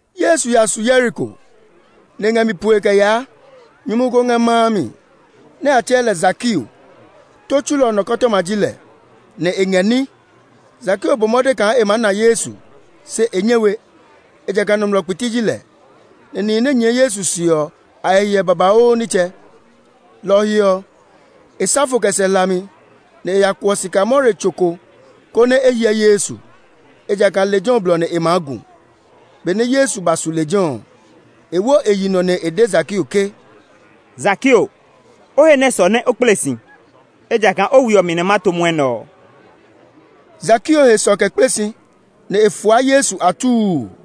Yesu ya su Yeriko, nɛ e ngɛ mi poe kɛ yaa. Nyumu ko ngɛ ma a mi, nɛ a tsɛɛ lɛ Zakeo. Tó tsulɔ nɔkɔtɔma ji lɛ, nɛ e ngɛ ní. Zakeo bɔ mɔde kaa e maa na Yesu, se e nyɛ we; ejakaa nɔmlɔ kpiti ji lɛ, nɛ nihi nɛ nyɛɛ Yesu se ɔ, a he hiɛ babauu nitsɛ. Lɔ ɔ he ɔ, e sa fo kɛ sɛ hlami, nɛ e ya kuɔ sikamore tso ko konɛ e hyɛ Yesu; ejakaa lejɛ ɔ blɔ nɛ e maa gu. Benɛ Yesu ba su lejɛ ɔ, e wo e yi nɔ nɛ e de Zakeo ke, “Zakeo, o he nɛ sɔ nɛ o kple si, ejakaa o we ɔ mi nɛ ma to mwɔnɛ ɔ.” Zakeo he sɔ kɛ kple si, nɛ e fua Yesu atuu.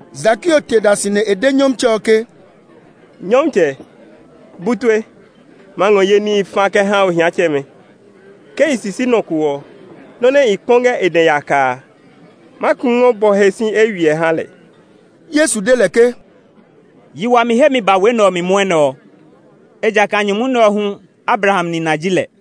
Zakeo te da si nɛ e de Nyɔmtsɛ ɔ ke, “Nyɔmtsɛ, bu tue! Ma ngɔ ye níhi fa kɛ ha ohiatsɛmɛ. Ke i sisi nɔ ko ɔ, nɔ́ nɛ i kpɔ ngɛ e dɛ yaka a, ma ku ngɔ bɔ he si eywiɛ ha lɛ.” Yesu de lɛ ke, “Yi wami hemi ba we nɛ ɔ mi mwɔnɛ ɔ; ejakaa nyumu nɛ ɔ hu Abraham nina ji lɛ.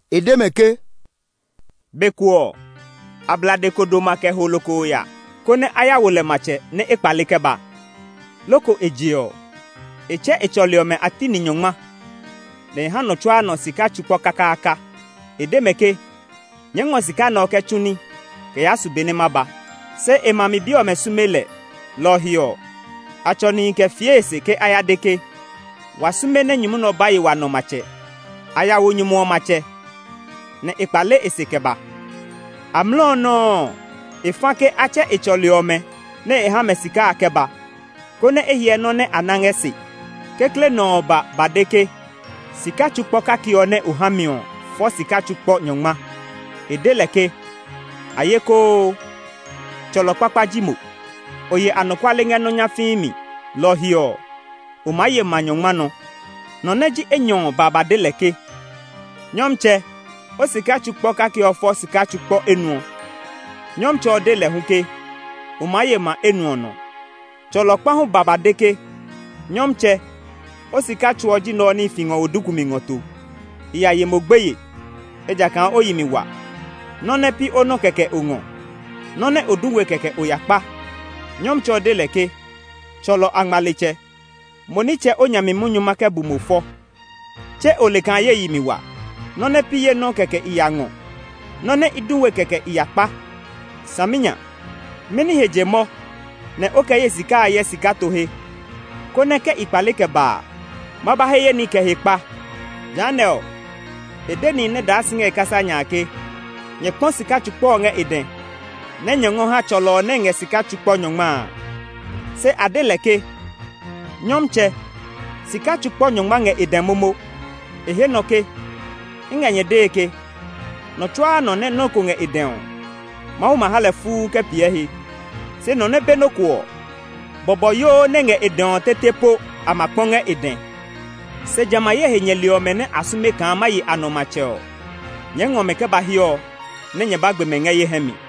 E de mɛ ke, “Be ko ɔ, ablade ko doma kɛ ho lokoo ya, konɛ a ya wo lɛ matsɛ nɛ e kpale kɛ ba. Loko e je ɔ, e tsɛ e tsɔli ɔmɛ a ti ni nyɔngma, nɛ e ha nɔ tsuaa nɔ sika tsu kpɔ kakaaka. E de mɛ ke, ‘Nyɛɛ ngɔ sika nɛ ɔ kɛ tsu ní kɛ yaa su be nɛ ma ba.’ Se e ma mi bi ɔmɛ sume lɛ. Lɔ ɔ he ɔ, a tsɔ nihi kɛ fie e se ke a ya de ke, ‘Wa sume nɛ nyumu nɛ ɔ ba ye wa nɔ matsɛ.’ “A na ya wo nyumu ɔ matsɛ, nɛ e kpale e se kɛ ba. Amlɔ ɔ nɔuu ɔ, e fa ke a tsɛ e tsɔli ɔmɛ nɛ e ha mɛ sika a kɛ ba, konɛ e hyɛ nɔ́ nɛ a na ngɛ se. Kekle nɔ ɔ ba ba de ke, ‘Sika tsu kpɔ kake ɔ nɛ o ha mi ɔ fɔ sika tsu kpɔ nyɔngma.’ E de lɛ ke, Ayekoo! Tsɔlɔ kpakpa ji mo! O ye anɔkuale ngɛ nɔ́ nyafii mi, lɔ ɔ he ɔ, o maa ye ma nyɔngma nɔ́. Nɔ nɛ ji enyɔ ɔ ba ba de lɛ ke, ‘Nyɔmtsɛ, o sika tsu kpɔ kake ɔ fɔ sika tsu kpɔ enuɔ.’ Nyɔmtsɛ ɔ de lɛ hu ke, ‘O maa ye ma enuɔ nɔ.’ “Tsɔlɔ kpa hu ba ba de ke, ‘Nyɔmtsɛ, o sika tsu ɔ ji nɛ ɔ nɛ i fi ngɔ wo duku mi ngɔ to. I ya ye mo gbeye, ejakaa o yi mi wa. Nɔ́ nɛ pi o nɔ́ kɛkɛ o ngɔ; nɔ́ nɛ o du we kɛkɛ o ya kpa.’ Nyɔmtsɛ ɔ de lɛ ke, ‘Tsɔlɔ angmaletsɛ! Mo nitsɛ o nya mi munyu ma kɛ bu mo fɔ! Tse o le kaa ye yi mi wa! Nɔ́ nɛ pi ye nɔ́ kɛkɛ i ya ngɔ; nɔ́ nɛ i du we kɛkɛ i ya kpa. Saminya! Mɛni he je mɔ nɛ o kɛ ye sika a yɛ sika to he, konɛ ke i kpale kɛ ba a, nɛ ma ba he ye ní kɛ hekpa?’ “Jehanɛ ɔ, e de nihi nɛ daa si ngɛ e kasa nya a ke, ‘Nyɛ kpɔ sika tsu kpɔ ɔ ngɛ e dɛ nɛ nyɛ ngɔ ha tsɔlɔ ɔ nɛ ngɛ sika tsu nyɔngma a.’ Se a de lɛ ke, ‘Nyɔmtsɛ, sika tsu kpɔ nyɔngma ngɛ e dɛ momo!’ E he nɔ ke, ‘I ngɛ nyɛ dee ke, nɔ tsuaa nɔ nɛ nɔ́ ko ngɛ e dɛ ɔ, Mawu ma ha lɛ fuu kɛ piɛ he. Se nɔ nɛ be nɔ́ ko ɔ, bɔbɔyoo nɛ ngɛ e dɛ ɔ tete po a ma kpɔ ngɛ e dɛ. Se jamɛ a ye he nyɛli ɔmɛ nɛ sume kaa ma ye a nɔ matsɛ ɔ, nyɛɛ ngɔ mɛ kɛ ba hiɛ ɔ nɛ nyɛ ba gbe mɛ ngɛ ye hɛ mi!’”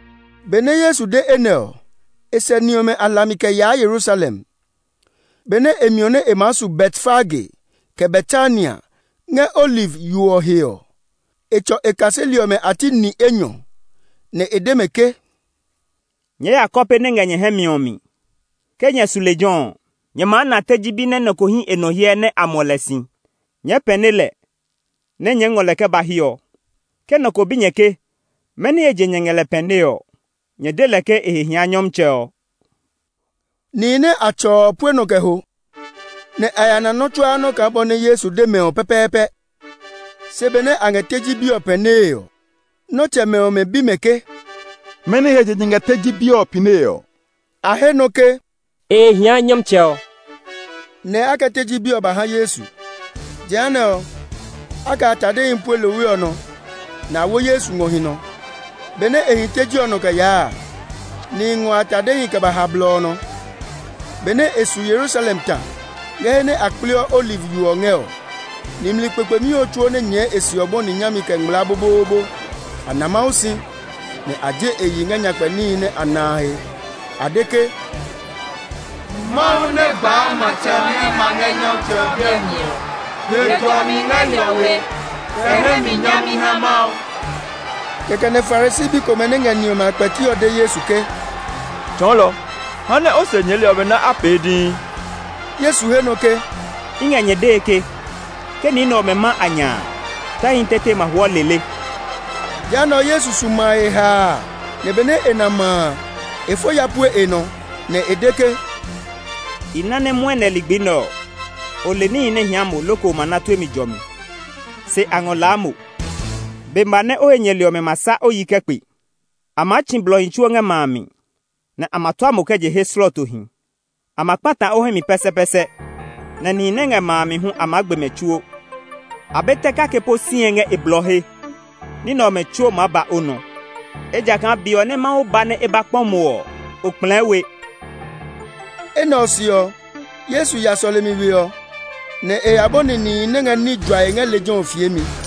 Benɛ Yesu de enɛ ɔ, e sɛ ni ɔmɛ a hlami kɛ yaa Yerusalem. Benɛ e miɔ nɛ e maa su Betfage, kɛ Betania, ngɛ Oliv yo ɔ he ɔ, e tsɔ e kaseli ɔmɛ a ti ni enyɔ, nɛ e de mɛ ke, “Nyɛɛ ya kɔpe nɛ ngɛ nyɛ hɛ mi ɔ mi. Ke nyɛ su lejɛ ɔ, nyɛ maa na teji bi nɛ nɔ ko hí e nɔ hyɛ nɛ a muɔ lɛ si. Nyɛɛ pɛne lɛ, nɛ nyɛɛ ngɔ lɛ kɛ ba hiɛ ɔ. Ke nɔ ko bi nyɛ ke mɛni he je nyɛ ngɛ lɛ pɛnee ɔ, nyɛ de lɛ ke e he hia Nyɔmtsɛ ɔ.” Nihi nɛ a tsɔ ɔ pue nɔ kɛ ho, nɛ a ya na nɔ́ tsuaa nɔ́ kaa bɔ nɛ Yesu de mɛ ɔ pɛpɛɛpɛ. Se benɛ a ngɛ teji bi ɔ pɛnee ɔ, nɔtsɛmɛ ɔmɛ bi mɛ ke, “Mɛni he je nyɛ ngɛ teji bi ɔ pɛnee ɔ?” A he nɔ ke, “E he hia Nyɔmtsɛ ɔ.” Nɛ a kɛ teji bi ɔ ba ha Yesu. Jehanɛ ɔ, a kɛ a tadehi pue lohwe ɔ nɔ, nɛ a wo Yesu ngɔ hi nɔ. Benɛ e hi teji ɔ nɔ kɛ yaa a, nihi ngɔ a tadehi kɛ ha blɔ ɔ nɔ. Benɛ e su Yerusalem ta, ngɛ he nɛ a kpleɔ Oliv yo ɔ ngɛ ɔ, nimli kpekpemi ɔ tsuo nɛ nyɛɛ e se ɔ bɔni nyami kɛ ngmlaa boboobo. A na Mawu si, nɛ a je e yi ngɛ nyakpɛ níhi nɛ a na a he. A de ke, “Mawu nɛ gbaa matsɛ ɔ nɛ ma ngɛ Nyɔmtsɛ ɔ biɛ mi ɔ! He jɔmi ngɛ hiɔwe, kɛ hɛ mi nyami ha Mawu!” Kɛkɛ nɛ Farisi bi komɛ nɛ ngɛ ni ɔmɛ a kpɛti ɔ de Yesu ke, “Tsɔɔlɔ, ha nɛ o se nyɛɛli ɔmɛ nɛ a pee dii!” Yesu he nɔ ke, “I ngɛ nyɛ dee ke, ke ni nɛ ɔmɛ ma a nya a, tɛhi tete ma hwɔ lele.” Jehanɛ ɔ, Yesu su ma a he haa, nɛ benɛ e na ma a, e fo ya pue e nɔ, nɛ e de ke, “I na nɛ mwɔnɛ ligbi nɛ ɔ, o le níhi nɛ hia mo loko o ma na tue mi jɔmi! Se a ngɔ laa mo! Be ma nɛ o he nyɛli ɔmɛ ma sa o yi kɛ kpe; a maa tsi blɔhi tsuo ngɛ ma a mi, nɛ a ma tua mo kɛ je he slɔɔtohi. A ma kpata o hɛ mi pɛsɛpɛsɛ, nɛ nihi nɛ ngɛ ma a mi hu a maa gbe mɛ tsuo; a be tɛ kake po sie ngɛ e blɔ he. Ní nɛ ɔmɛ tsuo maa ba o nɔ, ejakaa be ɔ nɛ Mawu ba nɛ e ba kpɔ mo ɔ, o kplɛɛ we.” Enɛ ɔ se ɔ, Yesu ya sɔlemi we ɔ, nɛ e ya bɔni nihi nɛ ngɛ ní juae ngɛ lejɛ ɔ fiemi.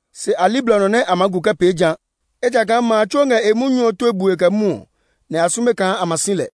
Se a li blɔ nɔ nɛ a maa gu kɛ pee ja; ejakaa ma a tsuo ngɛ e munyu ɔ tue bue kɛ mwɔɔ, nɛ a sume kaa a ma si lɛ.